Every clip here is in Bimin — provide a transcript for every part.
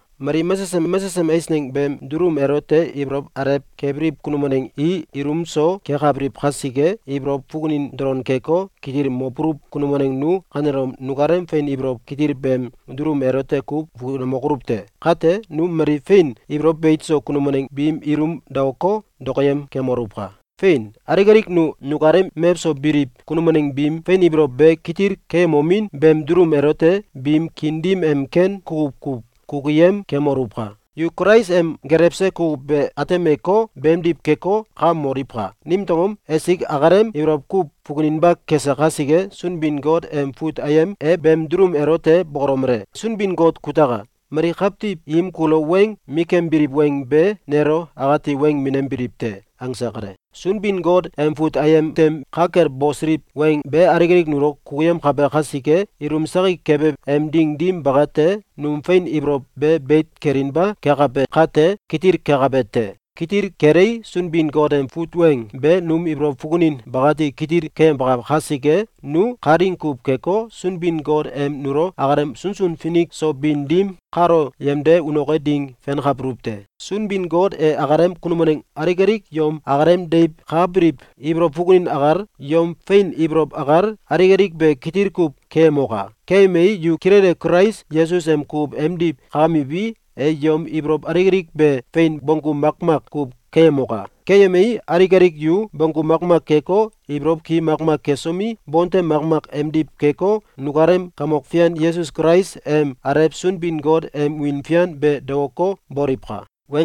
Mali mesesem mesesem eisneng beem dulum elote ibolow alew kebiliw kunum waneng i ilum so kekabiliw kasike, ibolow fukunin dolon keko, kitil mobuluw kunum waneng nu kanelom nukalem fein ibolow kitil beem dulum elote kuw fukunemokoluw te! Kate, nu mali fein ibolow beit so kunum waneng biim ilum daoko, dokoyem kemoluwka! Fein! Alik alik nu nukalem mewso biliw kunum waneng biim fein ibolow be kitil keyemomin beem dulum elote biim kiin dim em ken kukuw kuw kukuyem kemoluwka! Yu Kulais em gelewse kukuw be atemeko, beemdiw keko, kakamoliwka! Nimtew angom? Esik akalem ibolow kuw fukuninba kese kasike. Sunbin-Got em fut ayem e beem dulum elote bokolomele: “Sunbin-Got kutaka! Mali kawtiw im kulo weng mikembiliw weng be nelo akati weng minembiliw te.”, angse kale. Sunbin-Got em fut ayem tem ka kel bosiliw weng be alik alik nulo kukuyemkabe kasike, ilum sakik kebe em ding dim bakate, num fein ibolow be beit kelinba kekabe kate, kitil kekabe te. Kitil kelei, Sunbin-Got em fut weng be num ibolow fukunin bakati kitil keyemkabe kasike, nu kalaing kuw keko, Sunbin-Got em nulo akalem sunsun finik so bin dim kalo yemde unoke ding fenkabuluw te. Sunbin-Got e akalem kunum waneng alik alik yom akalem deiw kakabiliw ibolow fukunin akal, yom fein ibolow akal, alik alik be kitil kuw keyemoka! Keyemei, yu kilele Kulais Yesus em kukuw emdiw kakamiwi, e yom ibolow alik alik be fein bonggu makmak kuw keyemoka! Keyemei, alik alik yu bonggu makmak keko, ibolow ki makmak kesomi, bontem makmak emdiw keko, nukalem Kamok Fian Yesus Kulais em Alew Sunbin-Got em wiin fian be daoko, boliwka!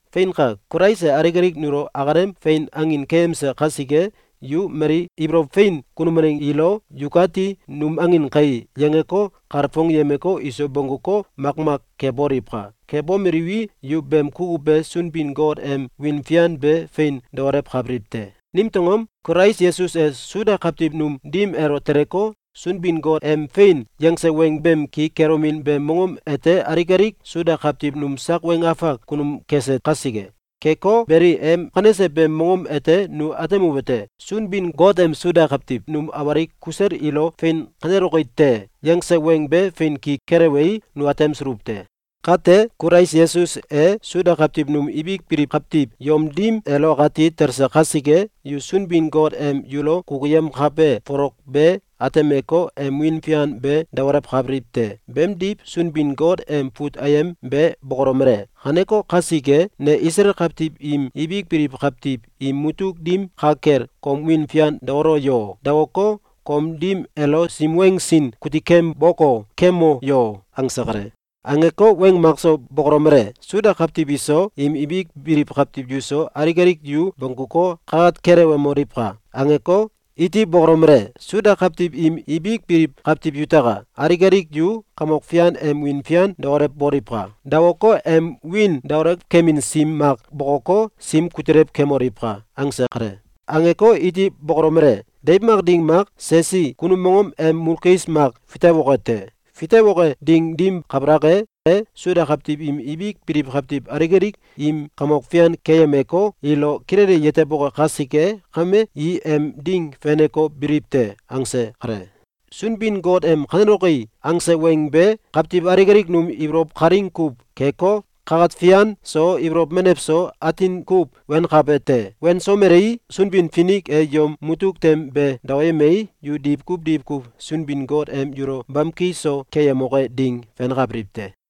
Feinka! Kulais e alik alik nulo akalem fein angin keyemse kasike, yu mali ibolow fein kunum waneng ilo “Yukati num angin kai!”, yangeko, kalfongyemeko, iso bongguko, makmak keboliwka! Kebomeliwi, yu beem kukuw be Sunbin-Got em wiin fian be fein daolewkabiliw te. Nimtew angom? Kulais Yesus e Suda kawtiw num dim elo teleko, Sunbin-Got em fein yangse weng beem ki kelomin beem mongom ete alik alik Suda kawtiw num sak weng afak kunum kese kasike. Keko beli, em kanese beem monggom ete nu atemuwete: Sunbin-Got em Suda kawtiw num awalik kusel ilo “Fein kaneloki te!”, yangse weng be fein ki kelewei, nu atemsuluw te. Kate, Kulais Yesus e Suda kawtiw num ibik biliw kawtiw yom dim elo akati talse kasike, yu Sunbin-Got em yulo kukuyemkabe folok be atemeko, em wiin fian be daolewkabiliw te. Beemdiw, Sunbin-Got em fut ayem be bokolomele: “Kaneko kasike, ne Isalael kawtiw im ibik biliw kawtiw im mutuk dim ka kel kom wiin fian daolo yo! Daoko, kom dim elo sim weng sin kutikemboko kemo yo!”, angse kale. Angeko, weng makso bokolomele: “Suda kawtiw iso, im ibik biliw kawtiw yuso, alik alik yu bongguko, kakat kelewemoliwka!”, angeko, iti bokolomele: “Suda kawtiw im ibik biliw kawtiw yutaka! Alik alik yu Kamok Fian em wiin fian daolewboliwka! Daoko, em wiin daolewkemin sim mak bokoko, sim kutilew kemoliwka!”, angse kale. Angeko, iti bokolomele: “Deiw mak ding mak Sesi kunum mongom em mulkis mak fitewoke te. Fitewoke ding dim kabalak e, e Suda kawtiw im ibik biliw kawtiw alik alik im kamok fian keyemeko, ilo kilele yeteboke kasike kame, i em ding feneko, biliw te.”, angse kale. Sunbin-Got em “Kaneloki!”, angse weng be kawtiw alik alik num ibolow kalaing kuw keko, kakat fian so, ibolow menew so, atin kuw wenkabe te. Wensomelei, Sunbin-Finik e yom mutuk tem be daoyemei, yu diwkuw diwkuw Sunbin-Got em yulo bamki so keyemoke ding fenkabiliw te.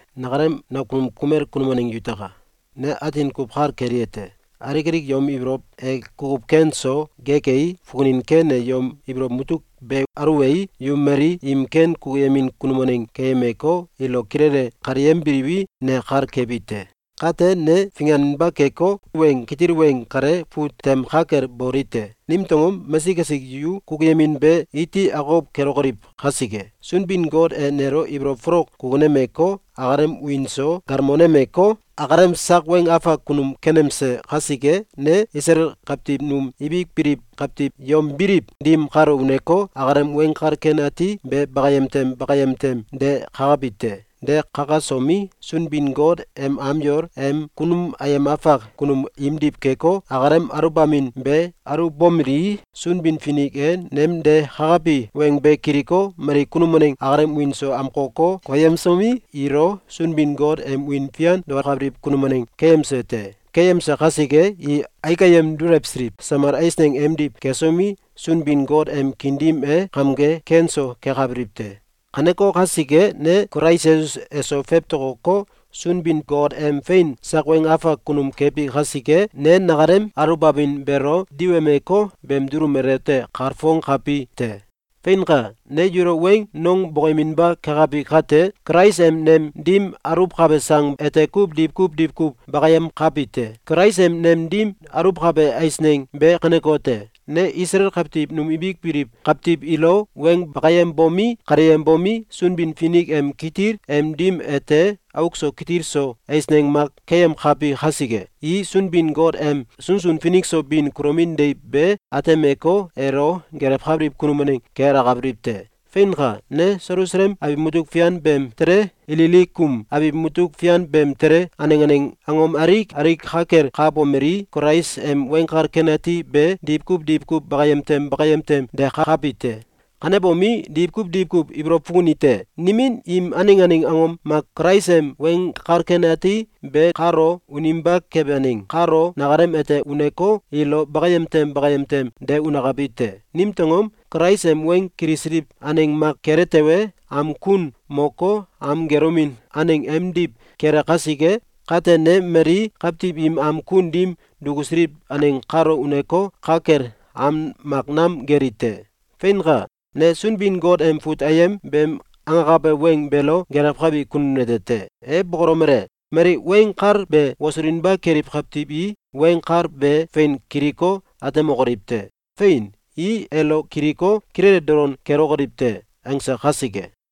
Nakalem nakunum kumel kunum waneng yutaka! Ne atin kuw kal kelite: Alik alik yom ibolow e kukuw ken so gekei, fukunin ken e yom ibolow mutuk be aluwei, yu mali im ken kukuyemin kunum waneng keyemeko, ilo kilele kaleyembiliwi, ne kal kebi te. Kate, ne finganinba keko, weng kitil weng kale fut tem ka kel boli te. Nimtew angom? Mesik esik yu kukuyemin be iti akokow kelokoliw kasike. Sunbin-Got e nelo ibolow folok kukunemeko, akalem wiin so galmonemeko, akalem sak weng afak kunum kenemse kasike, ne Isalael kawtiw num ibik biliw kawtiw yom biliw dim kalo uneko, akalem Weng Kal Ken Ati be bakayem tem bakayem tem de kakabi te. De kakasomi, Sunbin-Got em am yol em kunum ayem afak kunum imdiw keko, akalem aluwbamin be aluwbomelii, Sunbin-Finik e nem de kakabi weng be kiliko, mali kunum waneng akalem wiin so amkoko, koyemsomi, ilo Sunbin-Got em wiin fian daokabiliw kunum waneng keyemse te. Keyemse kasike, i aik ayem dulewsiliw samal eisneng emdiw kesomi, Sunbin-Got em kiin dim e kamge ken so kekabiliw te. Kaneko kasike, ne Kulais Yesus eso fewtokoko, Sunbin-Got em fein sak weng afak kunum kebi kasike, ne nakalem aluwbamin beelo diwemeko, beem dulum elote kalfongkabi te. Fein! Ne yulo weng nong bokoyeminba kekabi kate, Kulais em nem dim aluwkabe sang ete kuw diwkuw diwkuw bakayemkabi te. Kulais em nem dim aluwkabe eisneng be kanekote: Ne Isalael kawtiw num ibik biliw kawtiw ilo weng bakayembomi, kaleyembomi, Sunbin-Finik em kitil em dim ete auk so kitil so eisneng mak keyemkabi kasike, i Sunbin-Got em sunsun finik so bin kulomin deiw be atemeko, elo gelewkabiliw kunum waneng ke alakabiliw te. Feinka! Ne Selusalem abiw mutuk fian beem tele, Ililikum abiw mutuk fian beem tele, aneng aneng angom alik alik ka kel kakabomelii, Kulais em Weng Kal Ken Ati be diwkuw diwkuw bakayem tem bakayem tem de kakabi te. Kanebomi, diwkuw diwkuw ibolow fukunite: Nimin im aneng aneng angom mak Kulais em Weng Kal Ken Ati be kalo uninba kebe aneng kalo nakalem ete uneko, ilo bakayem tem bakayem tem de unakabi te. Nimtew angom? Kulais em weng kilisiliw aneng mak kele tewe, am kun moko, am gelomin aneng emdiw kele kasike. Kate, ne mali kawtiw im am kun dim dukusiliw aneng kalo uneko, ka kel am mak nam geli te. Feinka! Ne Sunbin-Got em fut ayem beem angakabe weng beelo gelewkabi kunum nete te. E bokolomele: “Mali weng kal be wosulinba keliw kawtiw i weng kal be fein kiliko, atemokoliw te. Fein! I elo kiliko, kilele dolon kelokoliw te!”, angse kasike.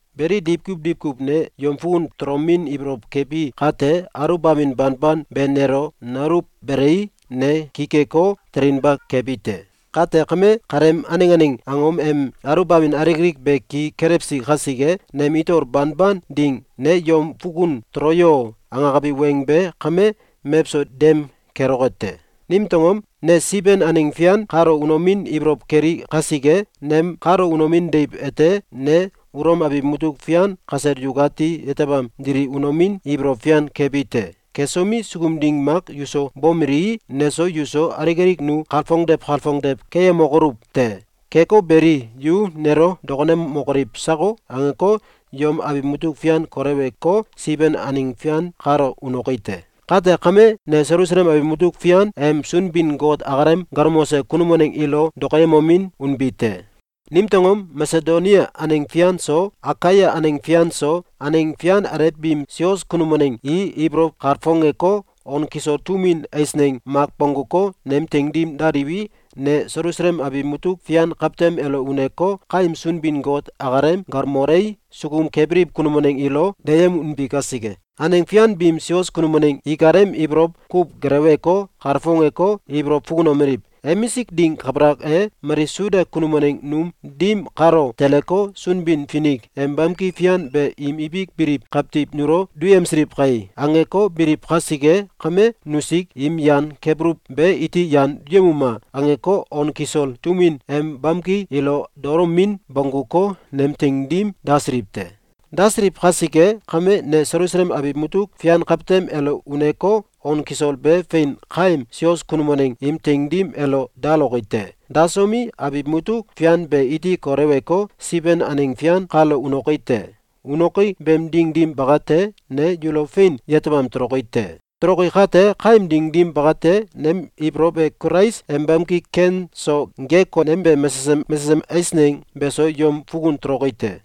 Beli, diwkuw diwkuw ne yom fukun tolomin ibolow kebi kate, aluwbamin banban be nelo nauluwbelei, ne ki keko, telinba kebi te. Kate kame, kaleem aneng aneng angom em aluwbamin alik alik be ki kelewsi kasike, nem itol banban ding “Ne yom fukun tolo yo!”, angekabi weng be kame mewso dem keloke te. Nimtew angom? Ne Siben aneng fian kalo unomin ibolow keli kasike. Nem kalo unomin deiw ete ne Ulom abiw mutuk fian kasel yukati yetebam dili unomin ibolow fian kebi te. Kesomi, sukum ding mak yuso bomelii, neso yuso alik alik nu kalfongdew kalfongdew keyemokoluw te. Keko beli, “Yu nelo dokonemokoliw sako?”, angeko, yom abiw mutuk fian koleweko, Siben aneng fian kalo unoki te. Kate kame, ne Selusalem abiw mutuk fian em Sunbin-Got akalem galmose kunum waneng ilo dokoyemomin unbi te. Nimtew angom? Masedonia aneng fian so, Akaia aneng fian so, aneng fian alew biim sios kunum waneng i ibolow kalfongeko, on kisol tum win eisneng mak bongguko, nem teing dim daliwi, ne Selusalem abiw mutuk fian kawtem elo uneko, kaem Sunbin-Got akalem galmolei, sukum kebiliw kunum waneng ilo deyem unbi kasike. Aneng fian biim Sios kunum waneng ikalem ibolow kuw geleweko, kalfongeko, ibolow fukunomeliw: “Emisik ding kabalak e, mali Suda kunum waneng num dim kalo teleko, Sunbin-Finik em bamki fian be im ibik biliw kawtiw nulo duyemsiliw kai!”, angeko, biliw kasike kame, “Nusik im yan kebuluw be iti yan duyemuma!”, angeko, on kisol tum win em bamki ilo dalomin bongguko, nem teing dim dasiliw te. Dasiliw kasike kame, ne Selusalem abiw mutuk fian kawtem elo uneko, on kisol be fein kaem sios kunum waneng im teing dim elo daloki te. Dasomi, abiw mutuk fian be iti koleweko, Siben aneng fian kalo unoki te. Unoki beem ding dim bakate, ne yulo fein yetebam toloki te. Toloki kate, kaem ding dim bakate, nem ibolow e Kulais em bamki ken so gek konembe mesesem mesesem eisneng beso yom fukun toloki te.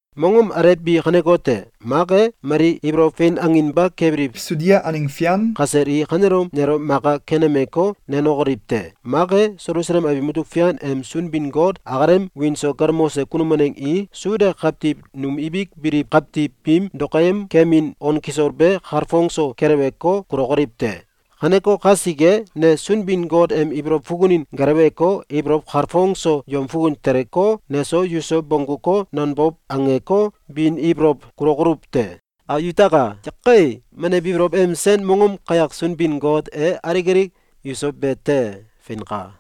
Mongom alew bi kanekote: Mak e, mali ibolow fein anginba kebiliw Sudia aneng fian kasel i kanelom nelo maka kenemeko, nenokoliw te! Mak e, Selusalem abiw mutuk fian em Sunbin-Got akalem wiin so galmose kunum waneng i Suda kawtiw num ibik biliw kawtiw biim dokoyemkemin on kisol be kalfong so keleweko, kulokoliw te. Kaneko kasike, ne Sunbin-Got em ibolow fukunin geleweko, ibolow kalfong so yom fukun teleko, neso yuso bongguko, nanbow angeko, bin ibolow kulokoluw te. Yutaka! Menew ibolow em sen mongom kayak Sunbin-Got e alik alik yuso be te! Feinka.